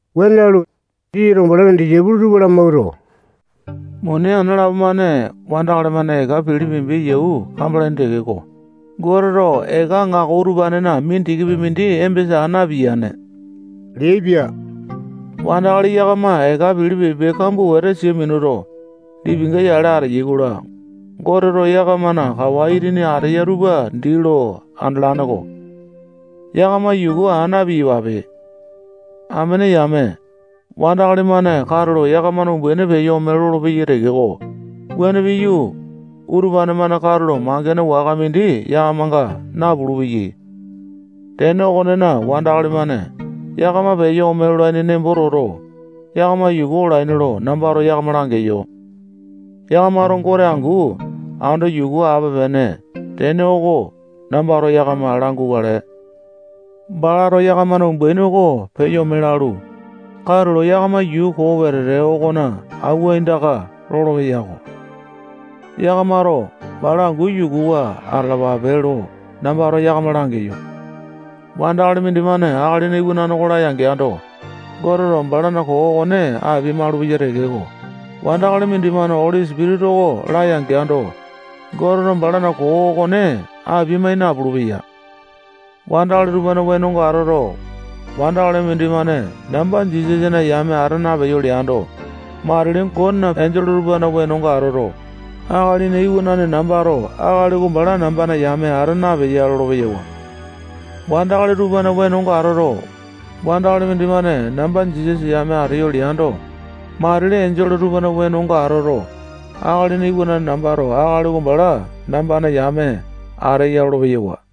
Wuane lalu, Jisasato balana disaipolo tupa lamawuato, muni ana lapo-mane wandakali-mane eka pilipimbi yau kambalaini tekeko, Goteto eka aŋako utupanena mindikipi mindi embesa aa napiyane leaipia. Wandakali yakama eka pilipimbi kambua wete sia minuto, lipinga-yale ateyai-kola, Goteto yakamana kawa itini ateya tupa dii lo andalane-ko. Yakama yuku aa na-piyapape. Amene yame, wandakali-mane katulo yakamana umbaini peyo ome lolopeyai tekeko, wuane piyu, utupane-mane katulo mangene waka mindi yakamanga napulu-peyai. Tene okonena, wandakali-mane yakama peyo omolaini nembo toto, yakamato yuku olaini lo nambato yakama langeyo. Yakamato Goteto angu ando yuku ape-pene tene oko nambato yakama langukale. Balato yakamana umbaini oko peyo ome lalu, katulo yakama yuu koo wetete okona awua aindaka lolopeya-ko. Yakamato bala angu yukuwa atalapape lo nambato yakama langeyo. Wandakali mindimane Akalina Iwanane oko laya-geando, Goteto balana koo okone apia-malupeya tekeko, wandakali mindimane Oli Sipitisa oko laya-geando, Goteto balana koo okone apia-mai napulu-peya. Wandakali tupana wenonga atoto, wandakali mindimane namba Jisasana yame ata napeyo leando, matili Gotena enjole tupana wenonga atoto, Akalina Iwanane nambato akali oko bala nambana yame ata napeya lolo-peyawa. Wandakali tupana wenonga atoto, wandakali mindimane namba Jisasa yame ateyo leando, matili enjole tupana wenonga atoto, Akalina Iwanane nambato akali oko bala nambana yame ateya lolo-peyawa.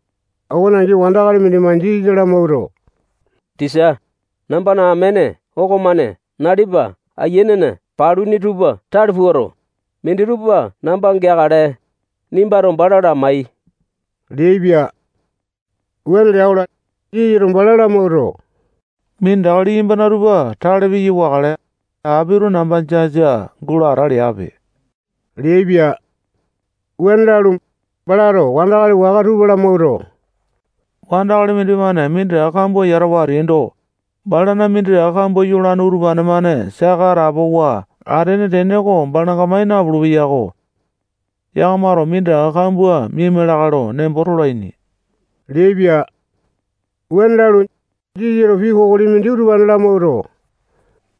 Okone angi, wandakali mindimane Jisasa lamawuato, tisa, nambana amene okomane nalipa ayianena paluni tupa tale puato, minditupa namba geakale, nimbato bala lamai leaipia. Wuane lea-kola, Jisasato bala lamawuato, minditaka liyambana tupa tale piya wakale, apito namba jasa gulo ata leape leaipia. Wuane lalu, balato wandakali waka tupa lamawuato, wandakali mindimane minditaka kambua yatawa ateando, balana minditaka kambua yolane utupane-mane saka atapowa atene tene oko balanga mai napulu-peyako. Yakamato minditaka kambua miaima lakae lo nembo tolaini leaipia. Wuane lalu, Jisasato pii kokoli mindi utupane lamawuato,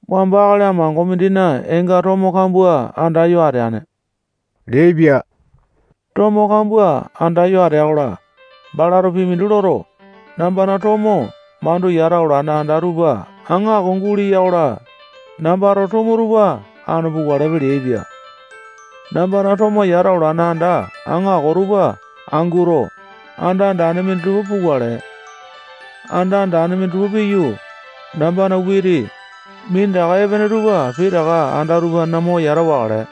wamba akali amango mindina eenga tomo kambua andayo ateane leaipia. Tomo kambua andayo atea-kola, balato pii mindi loto, nambana tomo mandu yata olane anda tupa aŋako guleya-kola, nambana tomo tupa anu pukalepe leaipia. Nambana tomo yata alawane anda aŋako tupa anguto, anda andane minditupa pukale. Anda andane tupa piyu, nambana witipi, minditaka epene tupa pitaka anda utupanena mo yata wakale.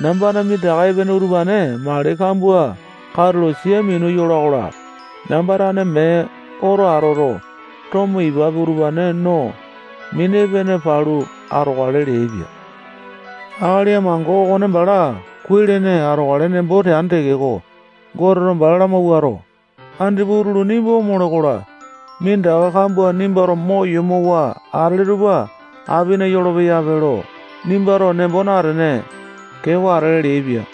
Nambana minditaka epene utupane mali kambua katulo sia minu yola-kola, namba tane mee oto atoto, tomo, ipapi, utupane no, mini epene palu atokale leaipia. Akali amango okone bala kuai-lene atokale nembo teane tekeko, Goteto bala lamawuato, andipa utulu nimba omole-kola, minditaka kambua nimbato mo yomowa atele tupa apina yolopeyape lo nimbato nembo natene, keewa atele leaipia.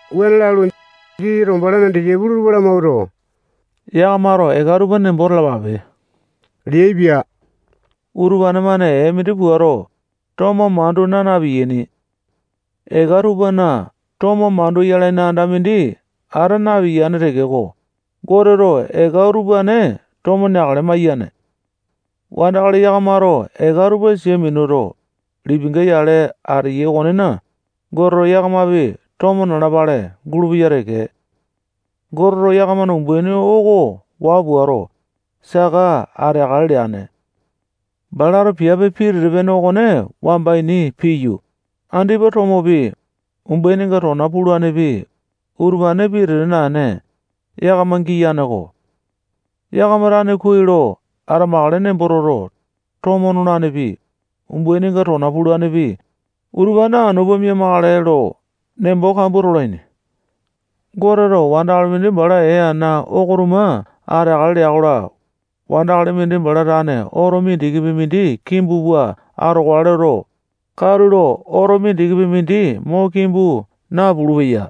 Wuane lalu, Jisasato balana disaipolo tupa lamawuato, yakamato eka tupa nembo talapape leaipia. Utupane-mane ee mindi puato, tomo mandu naa na-piyaini. Eka tupana tomo mandu yalaini anda mindi ata napiyane tekeko, Goteto eka utupane tomo neakale maiyane. Wandakali yakamato eka tupa sia minuto, lipinga yale ateyai okonena, Goteto yakamapi tomo nalapale gulupeya teke. Goteto yakamana umbaini oko waa puato, saka ateakale leane. Balato piape pitete-pene okone wamba ini piyu, andipa tomopi, umbaininga tona pulanepi, utupane pitete naene, yakama giyane-ko. Yakama tane kuai lo atamakale nembo toto, tomo nolanepi, umbaininga tona pulanepi, utupane anu pua mia-makale lo nembo kambua tolaini. Goteto wandakali mindi bala ee ana oko tuma ateakale lea-kola, wandakali mindi bala tane oto mindikipi mindi kimbu pua atokale loto, katulo oto mindikipi mindi mo kimbu napulu-peya.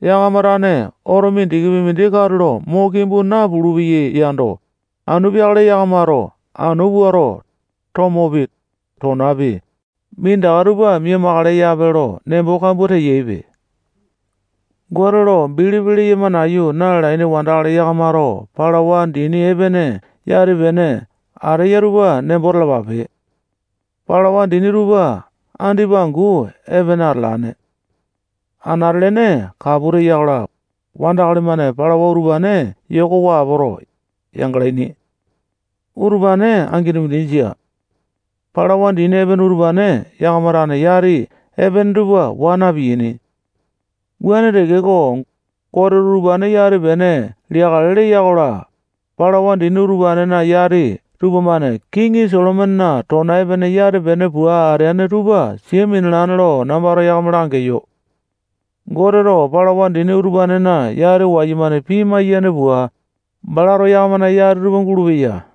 Yakama tane oto mindikipi mindi katulo mo kimbu napulu-peyai yando, anu peakale yakamato anu puato, tomopi, tonapi, minditaka tupa mia-makale yape lo nembo kambua teyaipe. Gote lo bilipi leyama nayu na-lalaini wandakali yakamato palawa dini epene yati-pene ateya tupa nembo talapape. Palawa dini tupa andipa angu epene atalane. Anate-lene kapu teya-kola, wandakali-mane palawa utupane yokowa apoto, yangalaini. Utupane angini mindi jia. Palawa dini epene utupane yakama tane yati epene tupa waa na-piyaini. Wuane tekeko, Goteto utupane yati-pene liyakale leya-kola, palawa dini utupanena yati tupamane kiŋi Solomonena tona epene yati-pene pua ateane tupa sia minalane lo nambato yakama langeyo. Goteto palawa dini utupanena yati wayumane pimai-yane pua, balato yakamana yati tupa gulupeya.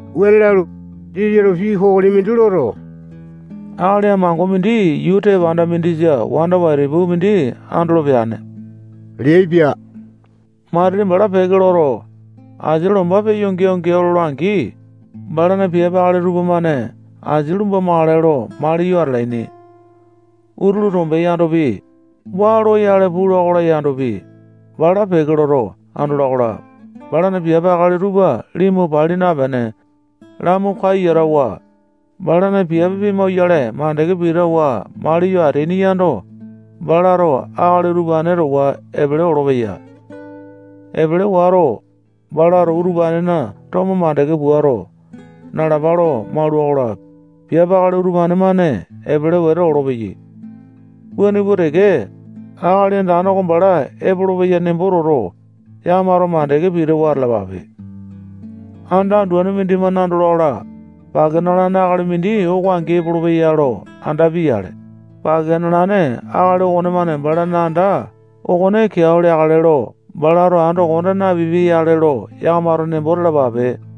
Wuane lalu, Jisasato pii kokoli mindi loto, akali amango mindi yuu tepanda mindisa wanda waitapu mindi andolo peane leaipia. Matili bala peke loto, asia lombanga peya geao-geao lola-angi, balana piape akali tupamane asia lumbamakale lo maliyo atalaini. Utulu tombe yandopi, waa loyale pula-kola yandopi, bala peke loto andola-kola, balana piape akali tupa limu pali napene, lamu kayu yatawa, balana piape pimauwayale mandeke pitawa maliyo ateaini yando, balato akali utupane towa epele olopeya. Epele wato, balato utupanena tomo mandeke puato, nalapa lo maula-kola, piape akali utupane-mane epele wete olopeyai. Wuane pua teke, Akali Andane oko bala epolopeya nembo toto, yakamato mandeke pitawa atalapape. Anda anduane mindimane andola-kola, pake nalane akali mindi oko angi epolopeya lo andapia-yale, pake nalane akali okonemane balana anda okone keao leakale lo balato ando konda napipia-yale lo yakamato nembo talapape.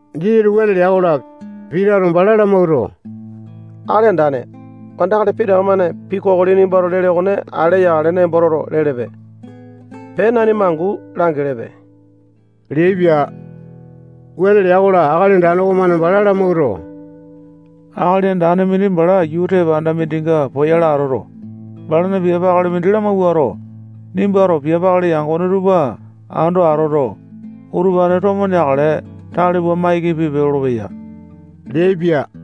Jisasato wuane lea-kola, Pitato bala lamawuato, Akali Andane, wandakali pitaka-mane pii kokoli nimbato lele okone ale yakale nembo toto, lelepe. Pee, nanima angu langelepe leaipia. Wuane lea-kola, Akali Andane okomane bala lamawuato, akali andane mindi bala yuu tepanda mindinga poyale atoto, balana piape akali mindi lamawuato, nimbato piape akali yangone tupa ando atoto, utupane tomo neakale tale pua maiki pipe lolopeya leaipia.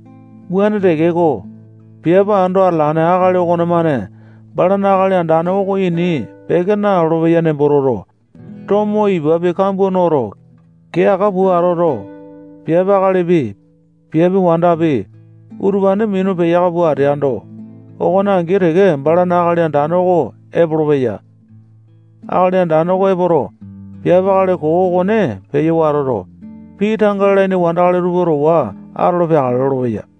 Wuane tekeko, piape ando atalane akali okonemane balana akali andane oko ini peke nalolo-peya nembo toto, tomo ipapi, kambua noto, kee aka pua atoto, piape akalipi, piape wandapi, utupane minu peyaka pua ateando, okone angi teke balana akali andane oko epolopeya. Akali andane oko epoto, piape akali koo okone peyo watoto, pii tanga lalaini wandakali tupa towa atolo peakale lolopeya.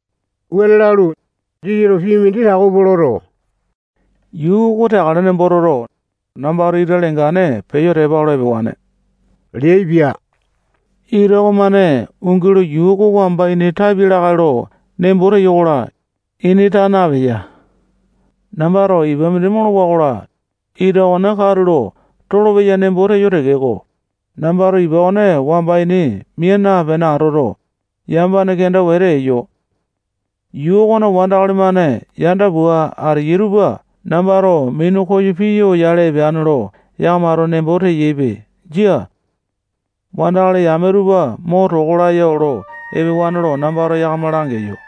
Wuane lalu, Jisasato pii mindi tako pua loto, yuu oko teakale nembo toto, nambato ita lengane peyo tepa olo epewane leaipia. Ita okonemane ungi lo yuu oko wamba ini tapia lakae lo nembo teyo-kola, ini taa napeya. Nambato ipa mindi molowa-kola, ita okone katulo tolopeya nembo teyo tekeko, nambato ipa okone wamba ini mia napene atoto, yamapane kenda wete eyo. Yuu okona wandakali-mane yanda pua ateyai tupa nambato minu koyo piya oyale epeane lo yakamato nembo teyaipe. Jia. Wandakali yame tupa mo toko laya olo epewane lo nambato yakama langeyo.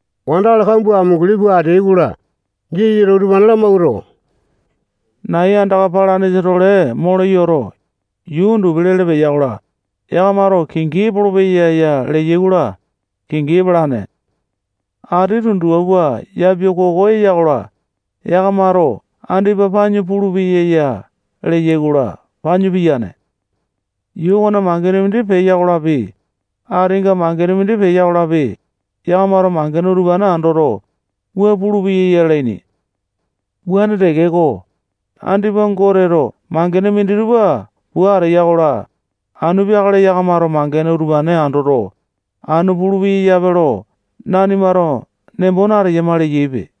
Wandakali kambua amunguli pua ateai-kola, Jisasato utupane lamawuato, nai andaka palanesa-tole mole yoto, yuu undupi lele peya-kola, yakamato kingi epolopeya ya leyai-kola, kingi epalane. Ati tundupa pua yapiakoko eya-kola, yakamato andipa panyu pulupeya ya leyai-kola, panyu piyane. Yuu okona mangene mindi peya-kolapi, atinga mangene mindi peya-kolapi, yakamato mangene utupane andoto, wua pulupeya lalaini. Wuane tekeko, andipa Goteto mangene minditupa pua ateya-kola, anu peakale yakamato mangene utupane andoto, anu pulu-peyape lo nanimato nembo nateyama leyaipe.